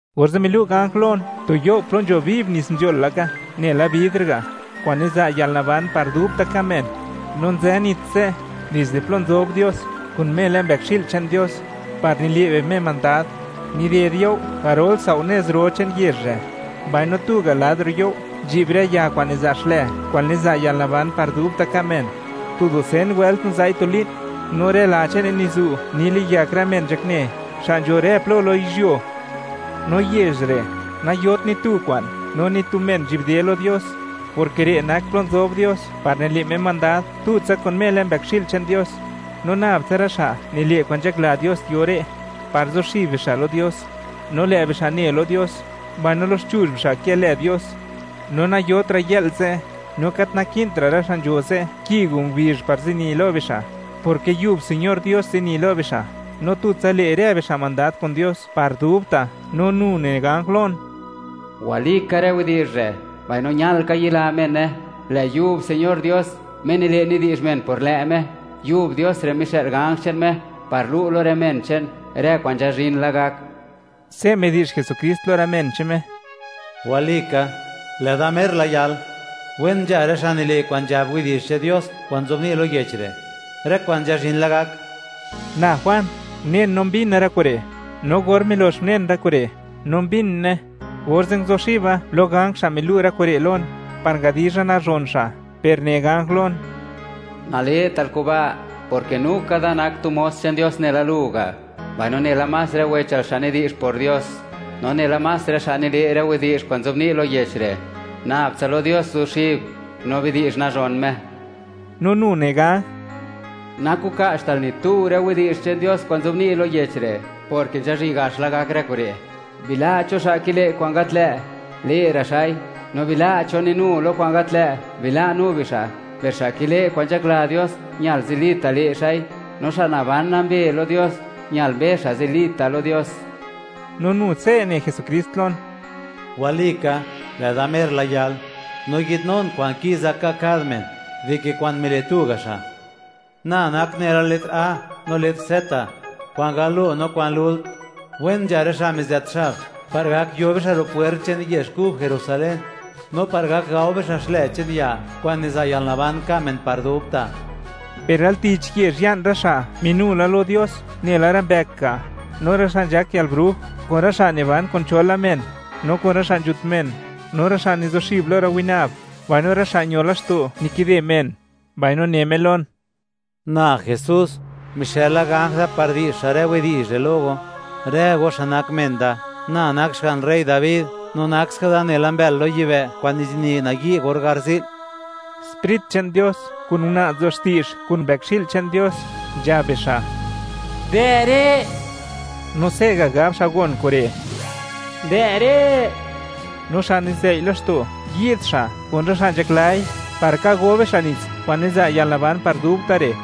Orze' milu' ganj lon tu you' plo nzho viv nits nzhol laka nela bidr ga', kwa'n niza' yalnaban par dubta' ka' men; no nzë nits ze' dizde plo nzob Dios kun Me lë Mbëkxi'l che'n Dios, par nile' bi Me mandad. Nided you' garol sao' nez ro che'n yezh re', mbaino tuga' lad ro' you' nzhi'b rë ya kwa'n niza' xlë kwa'n niza' yalnaban par dubta' ka' men; tu dusen wëlt niza'i tu li'n, no rë la che'ne nizu', niliyak rë men nzhakne, xa' nzho rë plo lo yizhyuo. No yezh re', nayot ni tu kwa'n no ni tu men nzhi'bde lo Dios, porke re' nak plo nzob Dios par nile' Me mandad tutsa kun Me lë Mbëkxi'l che'n Dios; no nab tsa rë xa' nile' kwa'n nzhakla Dios yo re', par zuxib bixa' lo Dios. No lë' bixa' ne lo Dios, mbaino loxchuzh bixa' kë lë Dios. No nayotra' yë'l ze', no gat naki'ntra' rë xa' nzho ze', ki o ngubizh par zini lo bixa', porke yub Señor Dios zini lo bixa', no tutsa le' rë bixa' mandad kun Dios par dubta'. No nu ne ganj lon: ―Walika rë widi'zh re', mbaino ñal ka yila mene. Lë' yub Señor Dios, Me nile', nidi'zh men por lë' Me; yub Dios re' mixë'l ganj che'n Me par lu' lo rë men che'n, rë kwa'n nzhazhin la gak. Se' midi'zh Jesukrist lo rë men che'n Me: ―¡Walika, lë' Da mer la yal! Wen nzha rë xa' nile' kwa'n nzhab widi'zh che'n Dios kwa'n nzobni' lo yech re', rë kwa'n nzhazhin la gak. Na Juan, unen no mbina rë kure', no or milox unen rë kure', no mbine, orze' nguzuxiba lo ganj xa' milu' rë kure' lon, par ngadizha nazhon xa', per ne ganj lon: ―¡Nale'tal kuba'!, porke nu ka da nak tu mos che'n Dios nela lu ga', mbaino nela más rë wechal xa' nidi'zh por Dios, no nela más rë xa' nile' rë widi'zh kwa'n nzobni' lo yech re'. Nabtsa lo Dios guzuxib, no bidi'zh nazhon Me. No nu ne ganj: ―Nakuka'chtal ni tu rë widi'zh che'n Dios kwa'n nzobni' lo yech re', porke nzhazhin gaxla gak rë kure' Bila' cho xa' kile' kwa'n gat lë', le'ra' xa'i; no bila' cho ninu lo kwa'n gat lë', bila' nu bixa'; per xa' kile' kwa'n nzhakla Dios, ñal zilita' le' xa'i; no xa' naban nambe lo Dios, ñal mbe xa' zilita' lo Dios. No nu, se' ne Jesukrist lon: ―¡Walika, lë' Da mer la yal!, no yi'dnun kwa'n ki'za ka' kad men, dike kwa'n mile' tuga' xa'. Na nak nela letr A no letr Z, kwa'n galo no kwa'n lult. Wen nzha rë xa' mizët xab, par gak yo bixa' ro' pwert che'n yezh kub Jerusalén, no par gak gao bixa' xlë che'n ya kwa'n niza' yalnaban ka' men par dubta'. Per al tich yezh ya'n rë xa' minu la lo Dios nela rë mbëk ga', no rë xa' nzhak yalbruj, kun rë xa' niban kun cho la men, no kun rë xa' nzhut men, no rë xa' nizuxib lo rë winab, mbaino rë xa' ño laxto', nikide men. Mbaino ne Me lon: ―Na Jesús, mixëla ganj da par di'zh xa' rë widi'zh re' lo go, rë go xa' nak men da; Na nak xga'n rey Dabi, nu nak da nela mbël lo yibë', kwa'n nizini nayi' or garzi'l. Sprit che'n Dios, kun una' nzo xti'zh kun Mbëkxi'l che'n Dios, nzhab bixa': ―Dë' re'. No se'ga' gab xa' gon kure': ―Dë' re'. No xa' nizei' laxto', yi'd xa', kun rë xa' nzhaklai, par ka go bixa' nits kwa'n niza' yalnaban par dubta' re'.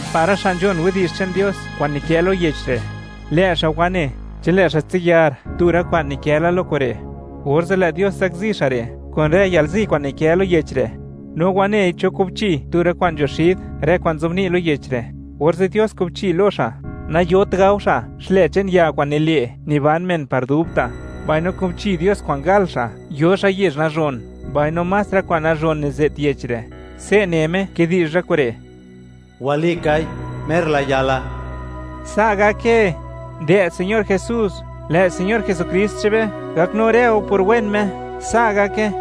Par rë xa' nzhon widi'zh che'n Dios kwa'n nikë lo yech re', lë' xa' wane; chi lë' xa' tsiyar tu rë kwa'n nikë la lo kure', orze' lë' Dios zakzi xa' re' kun rë yalzi kwa'n nikë lo yech re'. No wanei cho kubchi tu rë kwa'n nzho xid rë kwa'n nzobni' lo yech re', orze' Dios kubchi lo xa', nayot gao xa' xlë che'n ya kwa'n nile' niban men par dubta', mbaino kubchi Dios kwa'n gal xa' yo xa' yezh nazhon, mbaino más rë kwa'n nazhon nize't yech re'. Se' ne Me kidi'zh rë kure': ―Walikai, mer la yala. Sa' gake, ¡dë' Señor Jesús! Lë' Señor Jesukrist che'n be gaknu rë go por wen Me. Sa' gake.